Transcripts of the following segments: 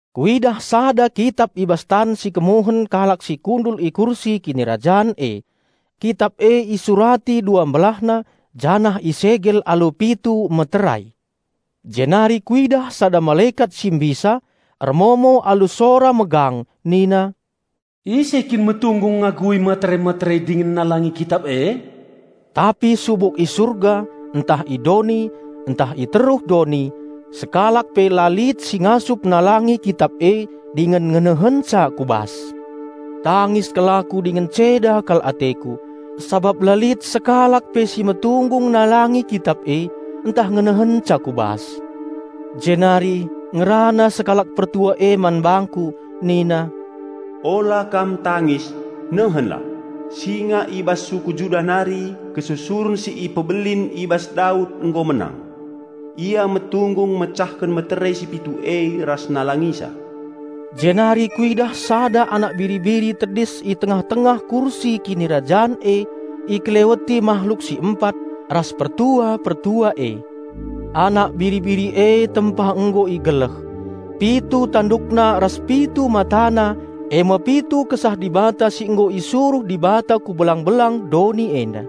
Kuidah sada Kitap i bas tan si kemuhen kalak si kundul i kursi kinirajan e. Kitap e isurati dua mbelahna, janah isegel alu pitu meterai. Jenari kuidah sada malekat si mbisa ermomo alu sora megang nina, "Ise kin metunggung ngagui meterai-meterai dingen nalangi kitap e?" Tapi subuk i surga, ntah i doni, ntah i teruh doni, sekalak pe la lit si ngasup nalangi kitap e dingen ngenehenca ku bas. Tangis kal aku dingen ceda kal ateku sabap la lit sekalak pe si metunggung nalangi kitap e ntah ngenehenca ku bas. Jenari ngerana sekalak pertua e man bangku nina, "Ula kam tangis. Nehenlah! Singa i bas suku Juda nari, kesusuren si ipebelin i bas Daud nggo menang. Ia metunggung mecahken meterai si pitu e ras nalangisa." Jenari kuidah sada Anak Biri-biri tedis i tengah-tengah kursi kinirajan e, ikeleweti mahluk si empat, ras pertua-pertua e. Anak Biri-biri e tempa nggo igeleh. Pitu tandukna ras pitu matana e me pitu Kesah Dibata si nggo isuruh Dibata ku belang-belang doni enda.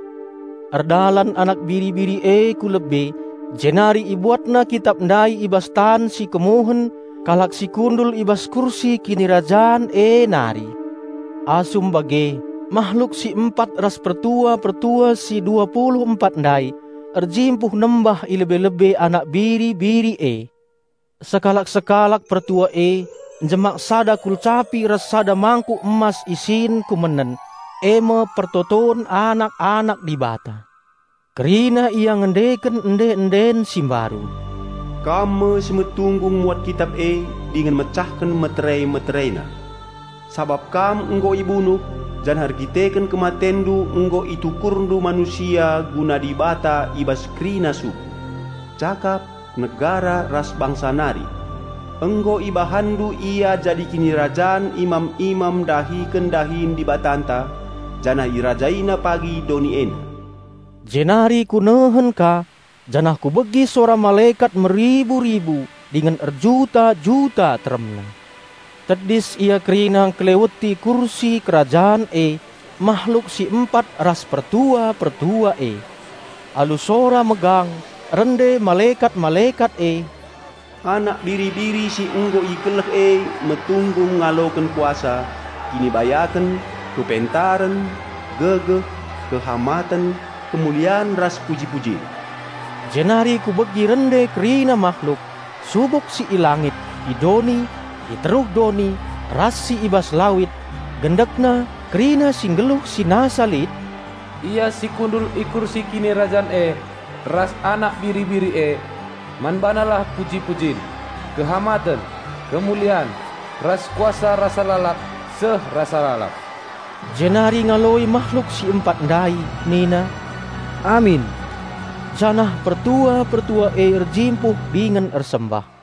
Erdalan Anak Biri-biri e ku lebe jenari IbuatNa kitap ndai i bas tan si kemuhen kalak si kundul i bas kursi kinirajan e nari. Asum bage, mahluk si empat ras pertua-pertua si dua pulu empat ndai erjimpuh nembah i lebe-lebe Anak Biri-biri e. Sekalak-sekalak pertua e njemak sada kulcapi ras sada mangkuk emas isin kumenen, e me pertoton anak-anak Dibata. Kerina ia ngendeken ende-enden si mbaru, "Kam me si metunggung muat kitap e dingen mecahken meterai-meteraina. Sabap Kam nggo ibunuh, janah erdandanken KematenNdu nggo ItukurNdu manusia guna Dibata i bas kerina suku, cakap, negara ras bangsa nari. Nggo IbahanNdu ia jadi Kinirajan imam-imam ndahiken dahin Dibatanta, janah irajaina pagi doni enda." Jenari kunehen ka, janah kubegi sora malekat meribu-ribu dingen erjuta-juta teremna! Tedis ia kerina ngkeleweti kursi kerajan e, mahluk si empat ras pertua-pertua e. Alu sora megang rende malekat-malekat e, "Anak Biri-biri si nggo igeleh e metunggung ngaloken kuasa, kinibayaken, kepentaren, gegeh, kehamaten, kemulian ras puji-pujin!" Jenari kubegi rende kerina mahluk, subuk si i langit, i doni, i teruh doni, ras si i bas lawit; gendekna kerina si nggeluh si nasa lit, "Ia si kundul i kursi kinirajan e ras Anak Biri-biri e, man BaNalah puji-pujin, kehamaten, kemulian, ras kuasa rasa lalap seh rasa lalap!" Jenari ngaloi mahluk si empat ndai nina, "Amin!" Janah pertua-pertua e erjimpuh dingen ersembah.